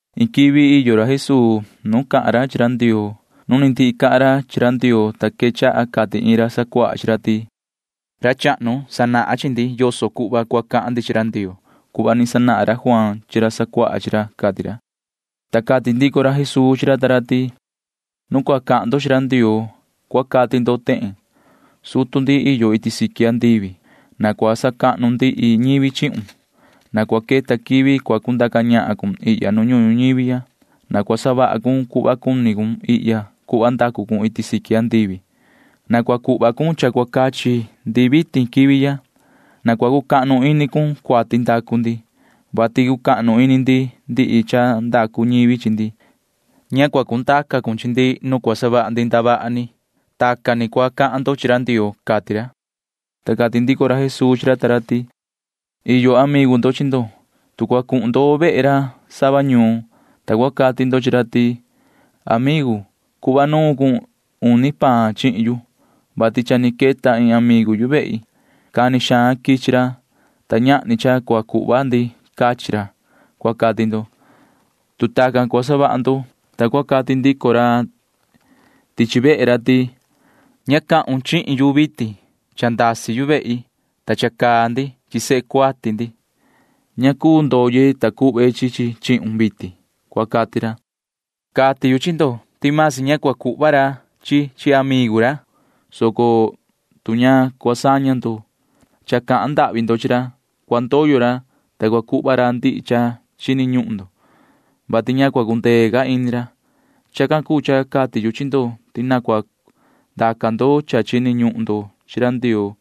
Iin quivi iyo ra Jesuu iin nu cahan ra chi ra Ndioo. Nu ni ndihi cahan ra chi ra Ndioo, ta quechaha cati iin ra sacuaha chi ra ti: ―Ra chahnu, sanahun chi ndi yoso cuhva cua cahan ndi chi ra Ndioo cuhva ni sanahan ra Juaan chi ra chica chi ra ―cati ra. Ta cati ndico ra Jesuu chi ra ta ra ti: ―Nu cua cahan ndo chi ra Ndioo, ta cua cati ndo tehen: Sutu ndi iyo iti siqui andivi, na cua sacahnu ndihi ñivi chihun. Na cua queta quivi cua cundaca ñahan cun ihya nu ñuhun ñuñivi ya. Na cua savaha cun cuhva cuni cun ihya cuhva ndacu cun iti siqui andivi. Na cua cuhva cun cha cua cachi ndi vitin quivi ya. Na cua cucahnu ini cun cuati ndacu ndi, vati cucahnu ini ndi ndihi cha ndacu ñivi chi ndi. Na ña cua cundaca cun chi ndi nu cua savaha ndi ndavaha ni. Tacan ni cua cahan ndo chi ra Ndioo ―cati ra. Ta cati ndico ra Jesuu chi ra ta ra ti: ―Iyo amigu ndo chi ndo. Tu cua cuhun ndo vehe ra sava ñuun, ta cua cati ndo chi ra ti: “Amigu, na cuhva nuun cun uni paan chihin yu, vati cha ni queta iin amigu yu vehi. Cani xaan quichi ra, ta ñahni cha cua cuhva ndi cachi ra,” cua cati ndo. Tu tacan cua savaha ndo, ta cua cati ndico ra tichi vehe ra ti: “Ña cahun chihin yu vitin. Cha ndasi yu vehi, ta cha caa ndi chi sehe cuati ndi. Ña cuu ndoye, ta cuhve chi chi chihun vitin,” cua cati ra. Cati yu chi ndo ti vasi ña cua cuhva ra ti cha amigu, soco tu ña cua saña ndo cha cahan ndahvi ndo chi ra, cua ndoyo ra, ta cua cuhva ra ndihi cha chini ñuhun ndo, [vati ña cua cundee ca ini ra]. Chacan cuu cha cati yu chi ndo ti na cua ndaca ndo cha chini ñuhun ndo chi ra Ndioo,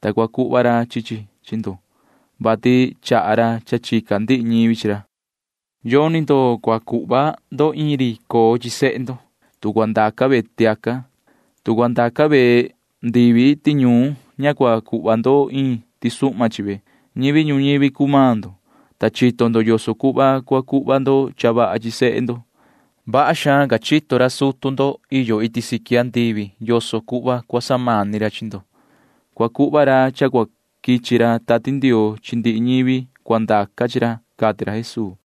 ta cua cuhva ra chi chi chi ndo, vati chaha ra cha chica ndihi ñivi chi ra. ’Yoni ndo cua cuhva ndo iin ri coo chi sehe ndo, tu cua ndaca ve tiaca. Tu cua ndaca ve ndivi tiñuun, ña cua cuhva ndo iin tisuhma chi ve. Ñivi ñuñivi cuu maan ndo, ta chito ndo yoso cuhva cua cuhva ndo cha vaha chi sehe ndo. Vaha xaan ca chito ra sutu ndo iti siqui andivi yoso cuhva cua samani ra chi ndo. Cua cuhva ra cha cua quichi ra Tati Ndioo chi ndihi ñivi cua ndaca chi ra ―cati ra Jesuu.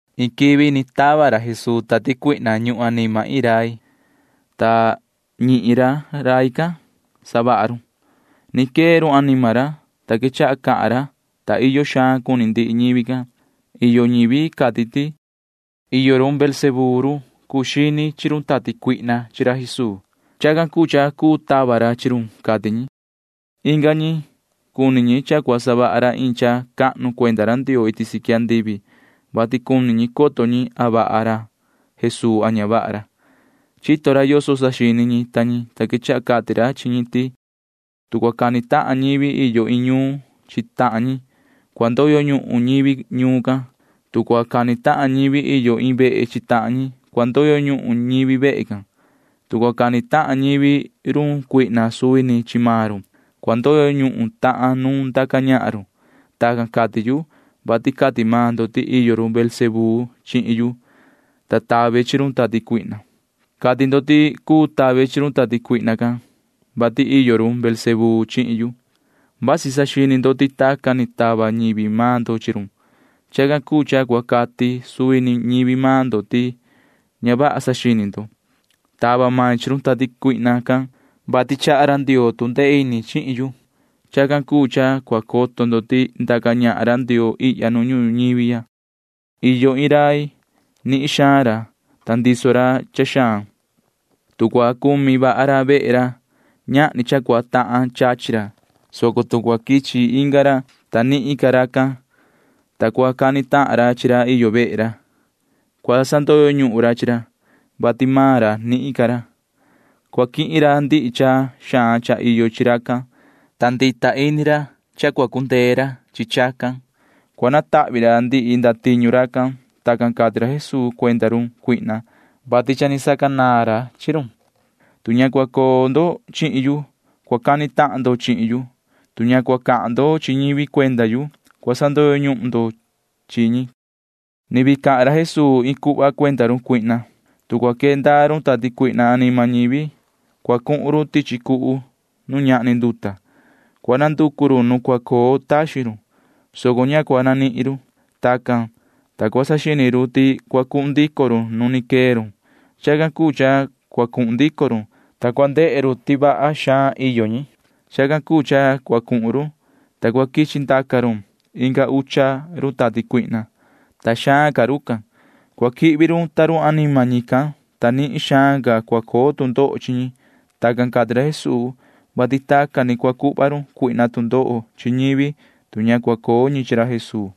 Iin quivi ni tava ra Jesuu tati cuihna ñuhun anima iin rai, ta ñihin ra rai can savaha run. Ni quee run anima ra, ta quechaha cahan ra, ta iyo xaan cuni ndihi ñivi can. Iyo ñivi cati ti: ―Iyo run Beelzebú run cuu xini chi run tati cuihna chi ra Jesuu. Chacan cuu cha cuu tava ra chi run ―cati ñi. Inga ñi―cuni ñi cha cua savaha ra iin cha cahnu cuenda ra Ndioo iti siqui andivi, vati cuni ñi coto ñi a vaha ra Jesuu a ña vaha ra. Chito ra yoso saxini ñi ta ñi, ta quechaha cati ra chi ñi ti: ―Tu cua cani tahan ñivi iyo iin ñuun chi tahan ñi, cua ndoyo ñuhun ñivi ñuun can. Tu cua cani tahan ñivi iyo iin vehe chi tahan ñi, cua ndoyo ñuhun ñivi vehe can. Tu cua cani tahan ñivi run Satanaa suvi ni chi maan run, cua ndoyo ñuhun tahan nu ndaca ñahan run. Tacan cati yu, vati cati maan ndo ti iyo run Beelzebú chihin yu, ta tave chi run tati cuihna. Cati ndo ti cuu tave chi run tati cuihna can, vati iyo run Beelzebú chihin yu. Vasi saxini ndo ti tacan ni tava ñivi maan ndo chi run. Chacan cuu cha cua cati suvi ni ñivi maan ndo ti ña vaha saxini ndo. Tava main chi run tati cuihna can, vati chaha ra Ndioo tu ndee ini chihin yu. Chacan cuu cha cua coto ndo ti ndaca ñahan ra Ndioo ihya nu ñuhun ñuñivi ya. ’Iyo iin rai. Nihin xaan ra, ta ndiso ra cha xaan. Tu cua cumi vaha ra vehe ra, ñahni cha cua tahan chachi ra, soco tu cua quichi inga ra, ta nihin ca racan, ta cua cani tahan ra chi ra iyo vehe ra, cua sandoyo ñuhun ra chi ra, [vati maan ra nihin ca ra]. Cua quihin ra ndihi cha xaan cha iyo chi racan, ta chinu ini ra ti cha cua cundee ra chi chacan. Cua natahvi ra ndihi ndatiñu racan. [Tacan cati ra Jesuu cuenda run Satanaa, vati cha ni sacanaan ra chi run.] ’Tu ña cua coo ndo chihin yu, cua cani tahan ndo chihin yu. Tu ña cua cahan ndo chi ñivi cuenda yu, cua sandoyo ñuhun ndo chi ñi. [Ni vii cahan ra Jesuu iin cuhva cuenda run Satanaa:] ’Tu cua quee ndaa run tati cuihna anima ñivi, cua cuhun run tichi cuhu nu ñahni nduta. Cua nanducu run nu cua coo taxin run, soco ña cua nanihin run. Tacan, ta cua saxini run ti cua cuhun ndico run nu ni quee run. Chacan cuu cha cua cuhun ndico run, ta cua ndehe run ti vaha xaan iyo ñi. Chacan cuu cha cua cuhun run, ta cua quichi ndaca run inga ucha run tati cuihna, ta xaan ca rucan. Cua quihvi run ta run anima ñican, ta nihin xaan ca cua coo tu ndoho chi ñi. [Tacan cati ra Jesuu, vati tacan ni cua cuhva run Satanaa tu ndoho chi ñivi, tu ña cua coo ñi chi ra Jesuu.]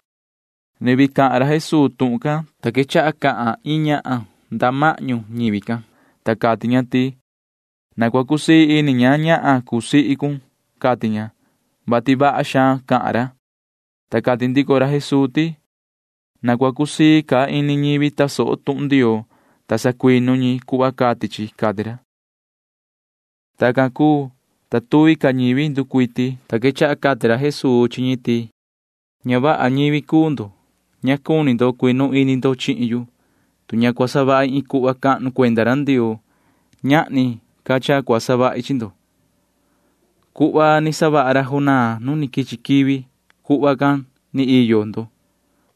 Ni vii cahan ra Jesuu tuhun can, ta quechaha cahan iin ñahan nda mahñu ñivi can, ta cati ña ti: ―¡Na cua cusii ini ña ñahan cuu sihi cun! ―cati ña, [vati vaha xaan cahan ra]. Ta cati ndico ra Jesuu ti: ―¡Na cua cusii ca ini ñivi tasoho tuhun Ndioo, ta sacuinu ñi cuhva cati chi! ―cati ra. Tacan cuu, ta tuvi ca ñivi ni nducuiti, ta quechaha cati ra Jesuu chi ñi ti: ―Ña vaha ñivi cuu ndo. Ña cuni ndo cuinu ini ndo chihin yu, tu ña cua savahi iin cuhva cahnu cuenda ra Ndioo. Ñahni ca cha cua savahi chi ndo. Cuhva ni savaha ra Jonaa nu ni quichi quivi―cuhva can ni iyo chi ndo.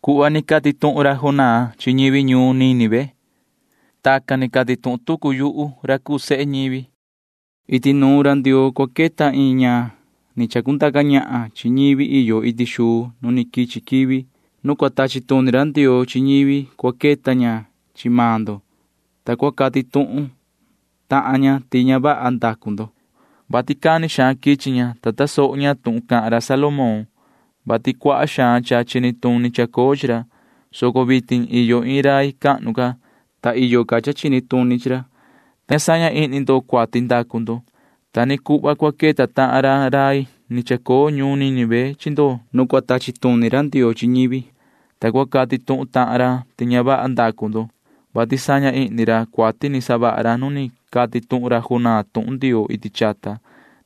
Cuhva cati tuhun ra Jonaa chi ñivi ñuun Nínive―tacan ni cati tuhun tucu yuhu ra cuu sehe ñivi. Iti nuun ra Ndioo cua queta iin ñahan ni chacundaca ñahan chi ñivi iyo iti xuu nu ni quichi quivi. Nu cua tachi tuni ra Ndioo chi ñivi cua queta ña chi maan ndo, ta cua cati tuhun tahan ña ti ña vaha ndacu ndo, vati cani xaan quichi ña, ta tasoho ña tuhun cahan ra Salomón, vati cuaha xaan cha chini tuni chacoo chi ra, soco vitin iyo iin rai cahnu ca, ta iyo ca cha chini tuni chi ra, [ta ña saña ihni ndo cuati ndacu ndo]. Ta ni cuhva cua queta tahan ra rai ni chacoo ñuun Nínive chi ndo nu cua tachi tuni ra Ndioo chi ñivi, ta cua cati tuhun tahan ra ti ña vaha ndacu ndo, vati saña ihni ra cuati ni savaha ra nu ni cati tuhun ra Jonaa tuhun Ndioo iti chata,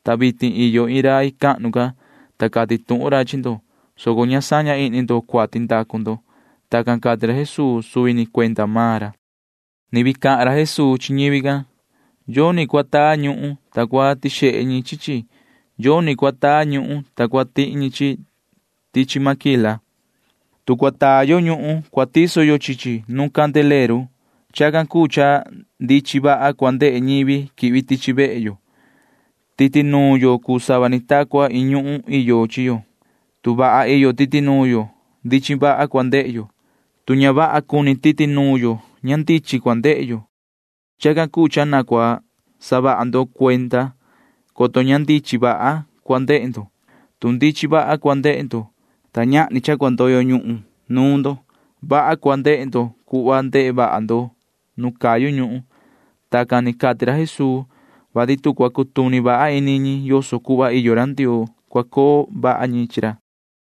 ta vitin iyo iin rai cahnu ca, ta cati tuhun ra chi ndo, [soco ña saña ihni ndo cuati ndacu ndo]. Tacan cati ra Jesuu suvi ni cuenda maan ra. [Ni vii cahan ra Jesuu chi ñivi can:] ’Yoni cua taa ñuhun, ta cua tixehe ñi chi chi. Yoni cua taa ñuhun, ta cua tihi ñi chi chi tichi máquila. Tu cua taa yo ñuhun, cua tiso yo chi chi nu candileru. Chacan cuu cha ndichin vaha cua ndehe ñivi quihvi tichi vehe yo. Titi nuun yo cuu sava ni ta cua iin ñuhun iyo chi yo. Tu vaha iyo titi nuun yo, ndichin vaha cua ndehe yo. Tu ña vaha cuni titi nuun yo, ña ndichin cua ndehe yo. Chacan cuu cha na cua saha ndo cuenda, coto ña ndichin vaha cua ndehe ndo. Tu ndichin vaha cua ndehe ndo, ta ñahni cha cua ndoyo ñuhun nuun ndo, vaha cua ndehe ndo cuhva ndehe vaha ndo nu cayu ñuhun. [Tacan ni cati ra Jesuu, vati tu cua cutuni vaha ini ñi yoso cuhva iyo ra Ndioo, cua coo vaha ñi chi ra.]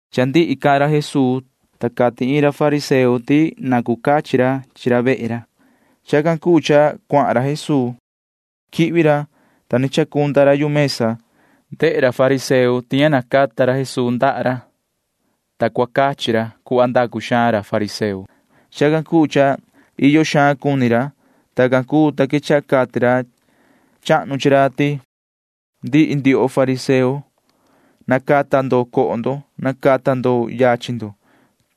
Cha ndihi cahan ra Jesuu, ta cati iin ra fariseo ti na cu cachi ra chi ra vehe ra. Chacan cuu cha cuahan ra Jesuu. Quihvi ra, ta ni chacunda ra yu mesa. Ndehe ra fariseo can ti ña tuhva ra Jesuu nacata xihna ra ndaha ra, ta sa cua cachi ra cuhva ndacu xaan ra fariseo. Chacan cuu cha iyo xaan cuni ra. Tacan cuu, ta quechaha cati ra chahnu chi ra ti: ―Ndihi ndioho fariseo, nacata ndo coho ndo. Nacata ndo yachin ndo.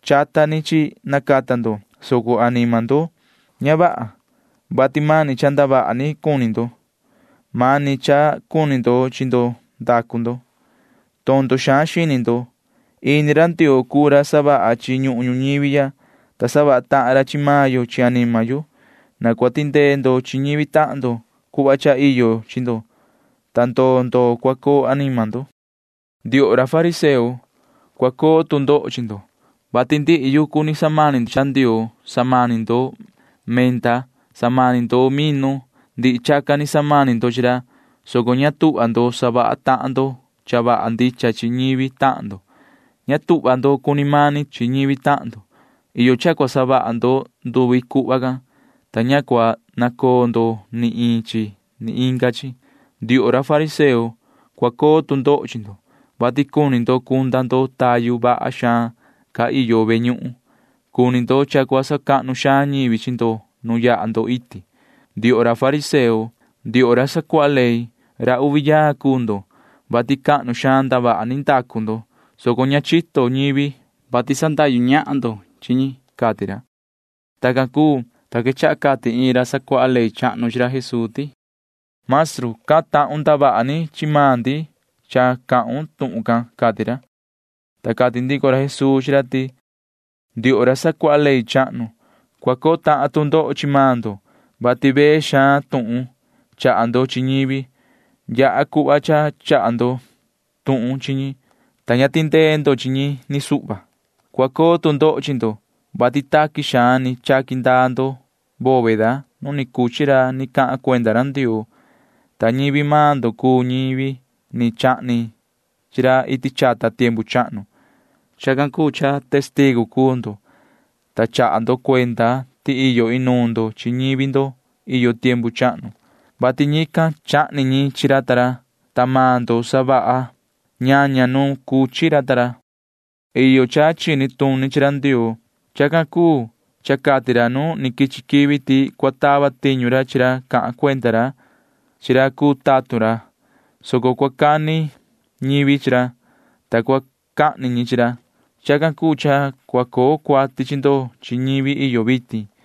Chata ni chi nacata ndo, soco anima ndo ña vaha, vati mani cha ndavaha ni cuni ndo. Mani cha cuni ndo chi ndo ndacu ndo. Tondo xaan xini ndo. Ini ra Ndioo cuu ra savaha chi ñuhun ñuñivi ya, ta savaha tahan ra chi maan yo chi anima yo. Na cua tindee ndo chi ñivi tahan ndo cuhva cha iyo chi ndo, ta ndoo ndoo cua coo anima ndo. ’Ndioho ra fariseo, cua coo tu ndoho chi ndo, vati ndihi yucu ni samani ndo chi ra Ndioo. Samani ndo menta. Samani ndo minu. Ndihi chacan ni samani ndo chi ra, soco ña tuhva ndo savaha tahan ndo cha vaha ndicha chi ñivi tahan ndo. Ña tuhva ndo cuni mani tahan ndo chi ñivi tahan ndo. Iyo cha cua savaha ndo nduvi cuhva can, ta ña cua nacoo ndo ni iin chi ni inga chi. ’Ndioho ra fariseo, cua coo tu ndoho chi ndo, vati cuni ndo cunda ndo tayu vaha xaan ca cha iyo ve ñuhun. Cuni ndo cha cua sacahnu xaan ñivi chi ndo nu yaha ndo iti. ’Ndioho ra fariseo, ndioho ra sacuaha ley, ra uvi yaa cuu ndo, vati cahnu xaan ndavaha ni ndacu ndo, soco ña chito ñivi, vati sandahyu ñahan ndo chi ñi ―cati ra. Tacan cuu, ta quechaha cati iin ra sacuaha ley chahnu chi ra Jesuu ti: ―Maestru, cahan tahun ndavaha ni chi maan ndi cha cahun tuhun can ―cati ra. Ta cati ndico ra Jesuu chi ra ti: ―Ndioho ra sacuaha ley chahnu, cua coo tahan tu ndoho chi maan ndo, vati vee xaan tuhun chaha ndo chi ñivi. Yaha cuhva cha chaha ndo tuhun chi ñi, ta ña tindee ndo chi ñi ni suhva. ’Cua coo tu ndoho chi ndo, vati taqui xaan ni chaqui ndaa ndo bóveda nu ni cuchi ra ni cahan cuenda ra Ndioo, ta ñivi maan ndo cuu ñivi ni chahni chi ra iti chata tiempu chahnu. Chacan cuu cha testigu cuu ndo, ta chaha ndo cuenda ti iyo inuun ndo chi ñivi ndo iyo tiempu chahnu, vati ñican―chahni ñi chi ra ta ra, ta maan ndo savaha ñaña nu ni cuchi ra ta ra. ’Iyo cha chini tuni chi ra Ndioo. Chacan cuu cha cati ra nu ni quichi quivi ti cua tava tiñu ra chi ra cahan cuenda ra chi ra cuu tatun ra, soco cua cani ñivi chi ra, ta cua cahni ñi chi ra. Chacan cuu cha cua coo cuati chi ndo chi ñivi iyo vitin,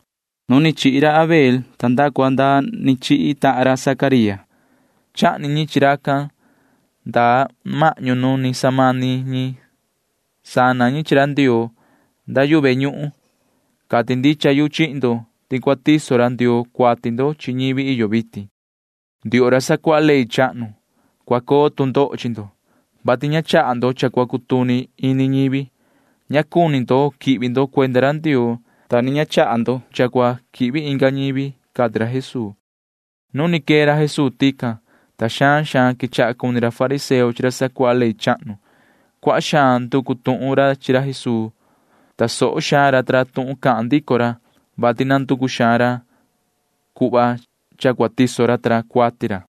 nu ni chihi ra Abel nda cua nda ni chihi tahan ra Zacaría. Chahni ñi chi racan nda mahñu nu ni samani ñi sana ñi chi ra Ndioo nda yu ve ñuhun. Cati ndicha yu chihin ndo ti cua tiso ra Ndioo cuati ndo chi ñivi iyo vitin. ’Ndioho ra sacuaha ley chahnu, cua coo tu ndoho chi ndo, vati ña chaha ndo cha cua cutuni ini ñivi. Ña cuni ndo quihvi ndo cuenda ra Ndioo, ta ni ña chaha ndo cha cua quihvi inga ñivi ―cati ra Jesuu. Nu ni quee ra Jesuu tican, ta xaan xaan quechaha cuni ra fariseo chi ra sacuaha ley chahnu. Cuaha xaan nducu tuhun xaan ra chi ra Jesuu. Tasoho xaan ra ta ra tuhun cahan ndico ra, vati nanducu xaan ra cuhva cha cua tiso ra ta ra cuati ra.